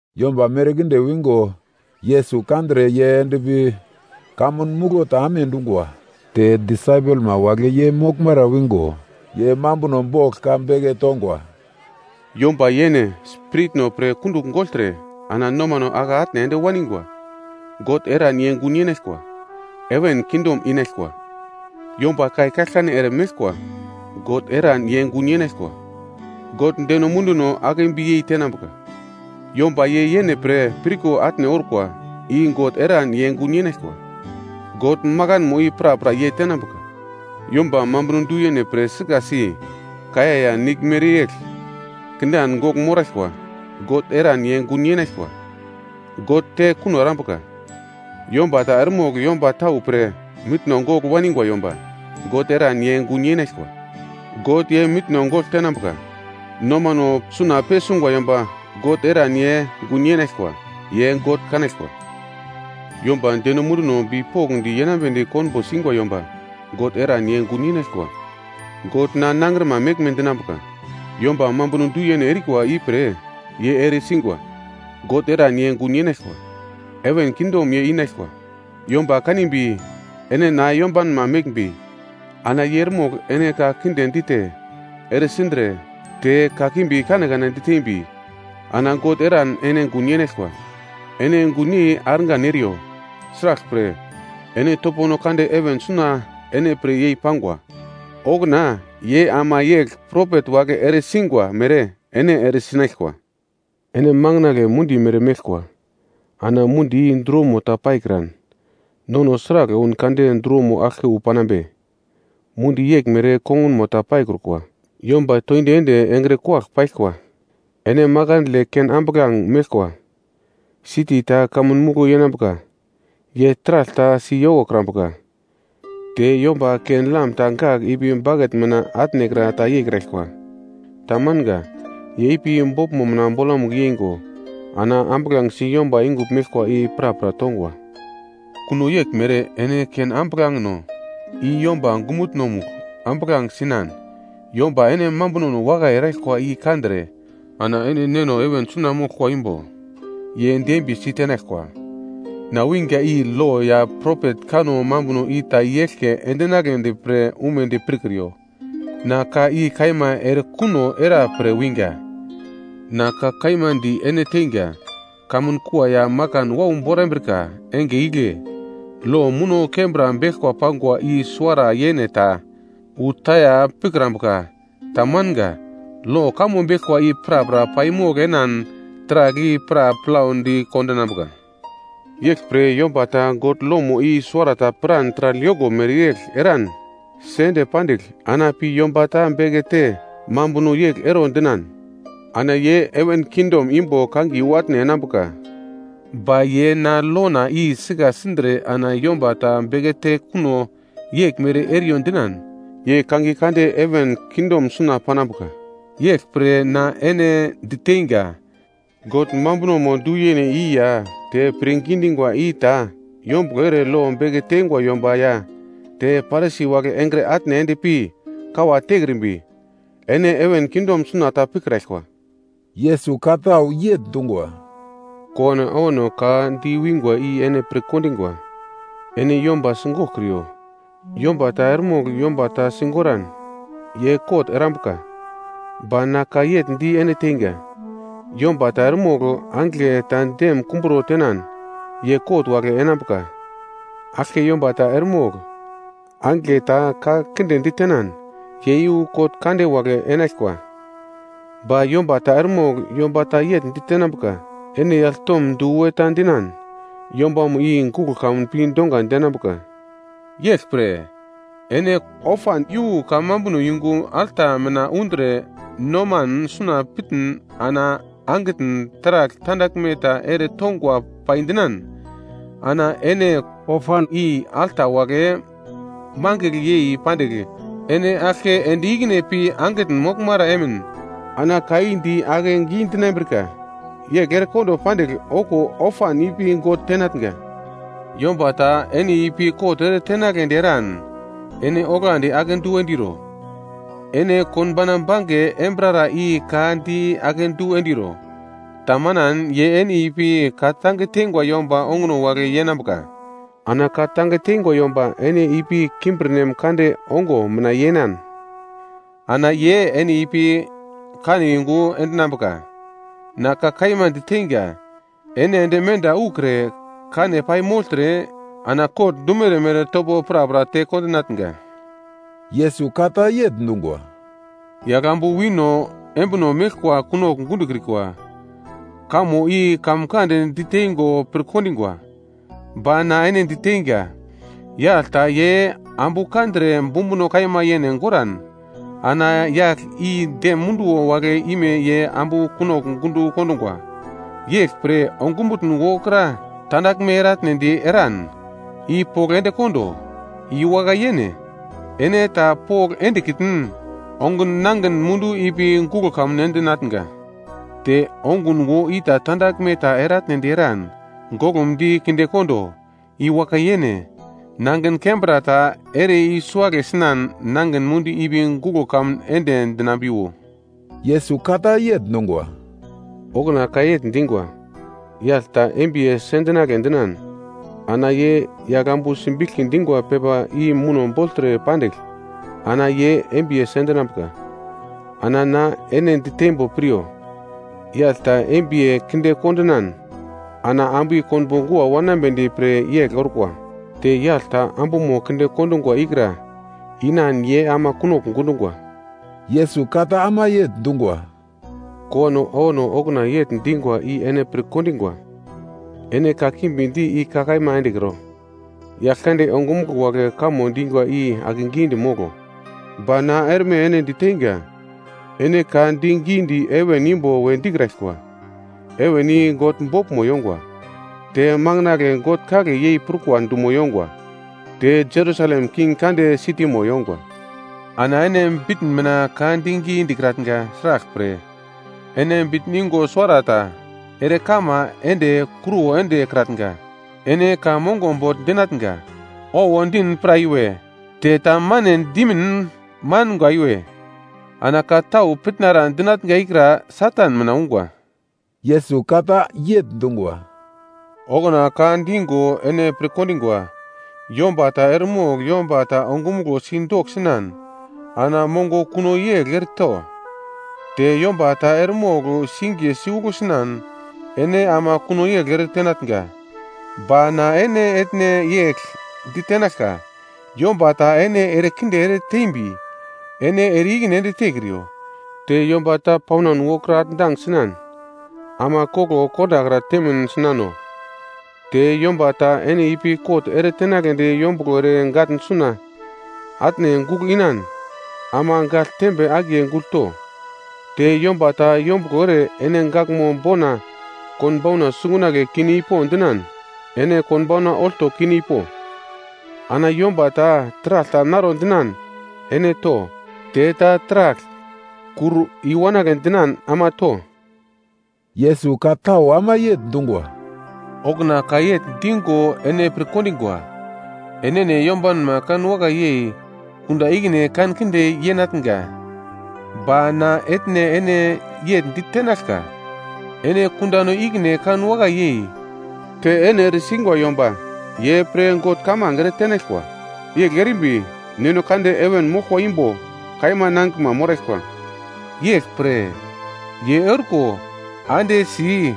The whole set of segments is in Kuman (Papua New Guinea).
Yomba merkinde wingo Yesus kandre ye endpi kamun muglo ta amedungwa. Te disaipelma wagle ye moglmara wingo. Ye mambuno bogl ka beke tongwa: “Yomba yene spiritno pre kundugl gogltre ana nomano ake atne ende waningwa, God eran ye gun yenaglkwa, heven kingdom inaglkwa. Yomba kai kaglkane ere meglkwa, God eran ye gun yenaglkwa, God deno munduno akebiyei tenambuka. Yomba ye yene pre pirko atne orkwa i God eran ye gun yenaglkwa, God makanmo i prapra ye tenambuka. Yomba mambuno du-yene pre sikasi, kaiya ya nigl mere yegl kindan gogl moraglkwa, God eran ye gun yenaglkwa. God te kuno erambuka. Yomba ta eremogl yomba tau pre mitno gogl waningwa yomba, God eran ye gun yenaglkwa. God ye mitno gogl tenambuka. Nomano suna pesungwa yomba God eran ye gun yenaglkwa, ye God kanaglkwa. Yomba deno munduno bipokndi yenambedi konbo singwa yomba God eran ye gun yenaglkwa, God na nangrima meglme dinambuka. Yomba mambuno du-yene erikwa ipre ye ere singwa, God eran ye gun yenaglkwa, heven kingdom ye inaglkwa. “Yomba kanimbi ene na yombanma meglmbi, ana ye eremogl ene ka kinde dite, ere sindre te, kakimbi kanekane ditembi, ana God eran ene gun yenaglkwa. Ene gunyei argan eriyo, sraglpre ene topono kande heven suna ene pre yei-pangwa, okuna ye ama yegl propet wagle ere singwa mere ene ere sinaglkwa. “Ene manginagle mundi mere meglkwa. Ana mundi i druwomo ta paikran, nono sragl oun kade druwomo aglke wu panambe? Mundi yeglmere kongunmo ta paikrukwa. Yomba toindi ende engre kuwagl paglkwa. “Ene makandle ken ambuglange meglkwa. Siti ta kamun muglo yenambuka, ye taragl ta si yokokrambuka. Te yomba ken-lam ta gagl ipi baket mina atnekra ta yeikraglkwa. Tamanga. Ye ipi boglmo mina bolamugl yeingo ana ambuglangesi yomba yungugl meglkwa i prapra tongwa. Kuno yeglmere, ene ambuglangeno i yomba ongumutno-mugl ambuglange sinan yomba ene mambunono wakai eraglkwa i kandre ana ene Neno heven suna moglkwa imbo ye dembiyesi tenaglkwa. “Na winga i lo ya propet kanno mambuno i ta i-eglke endinagledi pre umedi pirkriyo. Na ka i kaima erekuno era pre winga. Na ka kaima di ene teinga, kamun kua ya makan wau borambrika enge igle, lo muno kembra beglkwa pangwa i suwara yene ta, wu taya pikrambuka. Tamanga. Lo kamo beglkwa i prapra paimogl enan taragl i pra plaudi kondinambuka. Yeglpre yomba ta God lomo i suwarata piran taragl yoko mereyegl eran sende pandigl, ana pi yomba ta bekete mambuno yegl ero dinan, ana ye heven kingdom imbo kangiye wu atne enambuka, ba ye na lona i sika sindre ana yomba ta bekete kuno yeglmere eriyo dinan, ye kangiye kande heven kingdom suna panambuka. Yeglpre na ene diteinga, “God mambunomo du-yene i ya te pirngi dingwa i ta yombuglo ere lo beke teingwa yomba ya te Parisi wagle engre atne ende pi kawa tekrimbi, ene heven kingdom suna ta pikraglkwa.” Yesus ka tau yegl dungwa, “Kowano awano ka di wingwa i ene pirkondingwa, ‘Ene yomba sigoglkriyo, yomba ta eremogl yomba ta sigoran, ye kot erambuka.’ Ba na ka yegl di ene teinga, yomba ta eremogl angigle ta dem kumbro tenan ye kot wagle enambuka. Aglke yomba ta eremogl, angigle ta ka kinde ditenan, ye iyu kot kande wagle enaglkwa. Ba yomba ta eremogl yomba ta yegl ditenambuka. Ene yagl tom du we ta dinan, yombamo i guglo kamun pi donga denambuka. “Yeglpre, ene ofan iyu kamambuno yungu alta mina undre noman suna pitn ana angitn taragl tandaglme ta ere tongwa pai dinan, ana ene ofan i alta wagle mangigl yei pandigl, ene aglke ende ikine pi angitn moglmara emin ana ka i di akedu endinambrika, yegl erekondo pandigl okuwo ofan ipi God tenatnga. “Yomba ta ene ipi kot ere tenagledi eran, ene oglandi akedu endiro. Ene konbo bange enambrara i ka di akedu endiro, tamanan ye ene ipi ka tange teingwa yomba ongo wagle yenambuka. Ana ka tange teingwa yomba ene ipi kimbirnem kande ongo mina yenan, ana ye ene ipi kane yungu endinambuka. Na ka kaima diteinga, ene ende menda ukre kane paimogltre ana kot dumere mere topo prapra te kondinatnga.” Yesus ka ta yegl dungwa, “‘Yaglambu wino embino meglkwa kunogl gundokrikwa,’ kamo i kamkand diteingo pirkondingwa. Ba na ene diteinga, yagl ta ye ambu kandre bumbuno kaima yene goran, ana yagl i dem munduwo wagle ime ye ambu kunogl gundo kondungwa. Yeglpre ongumutn wokra tandaglme eratnedi eran, i pogl endekondo. I wakai yene, ene ta pogl endekitn, ongun nangin mundu ipi guglo kamun endinatnga. Te ongun wo i tandaglme ta eratnedi eran, goglumdi kinde kondo. I wakai yene, nangin kembra ta ere i-suagle sinan nangin mundu ipi guglo kamun ende dinambiwo.” Yesus ka ta yegl dungwa, “Okuna ka yegl dingwa, ‘Yagl ta embiye sendinagle dinan, ana ye yaglambu simbiglki dingwa pepa i muno bogltre pandigl, ana ye embiye sendinambuka.’ Ana na ene diteimbo piryo: Yagl ta embiye kinde kondinan, ana ambu i konbo gua wanambedi pre yegl orkwa. Te yagl ta ambumo kinde kondungwa ikra inan ye ama kunogl gundungwa.” Yesus ka ta ama yegl dungwa, “Kowano awano okuna yegl dingwa i ene pirkondingwa, ‘Ene kakimbi di i ka kaima endekro. Yaglkande ongumuglo wagle kamo dinga i akegidi moglo.’ Ba na erme ene diteinga, ene ka di gidi heven imbo we dikraglkwa, heven i God boglmo yongwa; te manginagle God kagle yei prukwa dumo yongwa, te Jerusalem, King Kande sitimo yongwa, ana ene bitn mina ka digi dikratnga. Sraglpre, ene bitn yungo suwarata ere kama ende kruwo ende erekratnga. Ene ka mongo bogl dinatnga. Owo din pra iwe, te tamane dimin manga iwe. Ana ka tau pitnara dinatnga ikra Satan mina ungwa.” Yesus ka ta yegl dungwa, “Okuna ka digo ene pirkondingwa, ‘Yomba ta eremogl yomba ta ongumuglo si doksinan, ana mongo kuno yegl ereto. Te yomba ta eremogl singiye si uglo sinan, ene ama kuno yegl ere tenatnga.’ Ba na ene etne yegl ditenaglka, yomba ta ene erekinde ere tembi, ene ere-ikine ende tekriyo. Te yomba ta paunan wokra atndang sinan, ama koglo kondakra temin sinano. Te yomba ta ene ipi kot ere tenagledi yombuglo ere gatn suna atne gugl inan, ama gagl tembe akiye gugl to. Te yomba ta yombuglo ere ene gaglmo bona konbauna sungunagle kine ipo dinan, ene konbauna olto kine ipo. Ana yomba ta taragl ta naro dinan, ene to, te ta taragl kur i-wanagle dinan ama to.” Yesus ka tau ama yegl dungwa, “Okuna ka yegl digo ene pirkondingwa, ‘Enene yombanma kanwakai yei, kundan ikine kankinde yenatnga.’ Ba na etne ene yegl ditenaglka, ene kundano ikine kanwakai yei, te ene eresingwa yomba ye pre God kamange eretenaglkwa. Yegl erimbi Neno Kande heven moglkwa imbo kaima nangiglma moraglkwa. Yeglpre, ye orko ande si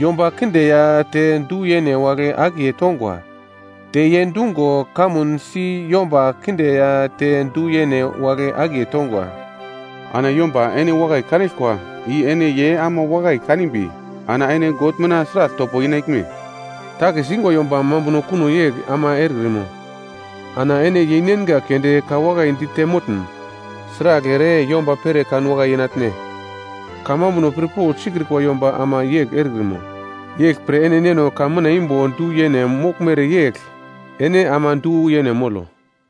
yomba kinde ya te du-yene wagle akiye tongwa, te ye dungo kamun si yomba kinde ya te du-yene wagle akiye tongwa. Ana yomba ene wakai kanaglkwa i ene ye ama wakai kanimbi ana ene God mina sragl topo inaglme? Takis ingwa yomba mambuno kuno yegl ama erekrimo? Ana ene yeinenga keunde ka wakai dite motn, sragl ere yomba pere kanwakai yenatne? Kamambuno pirpogl sikrikwa yomba ama yegl erekrimo? Yeglpre ene Neno heven imbo du-yene moglmere yegl ene ama du-yene molo.”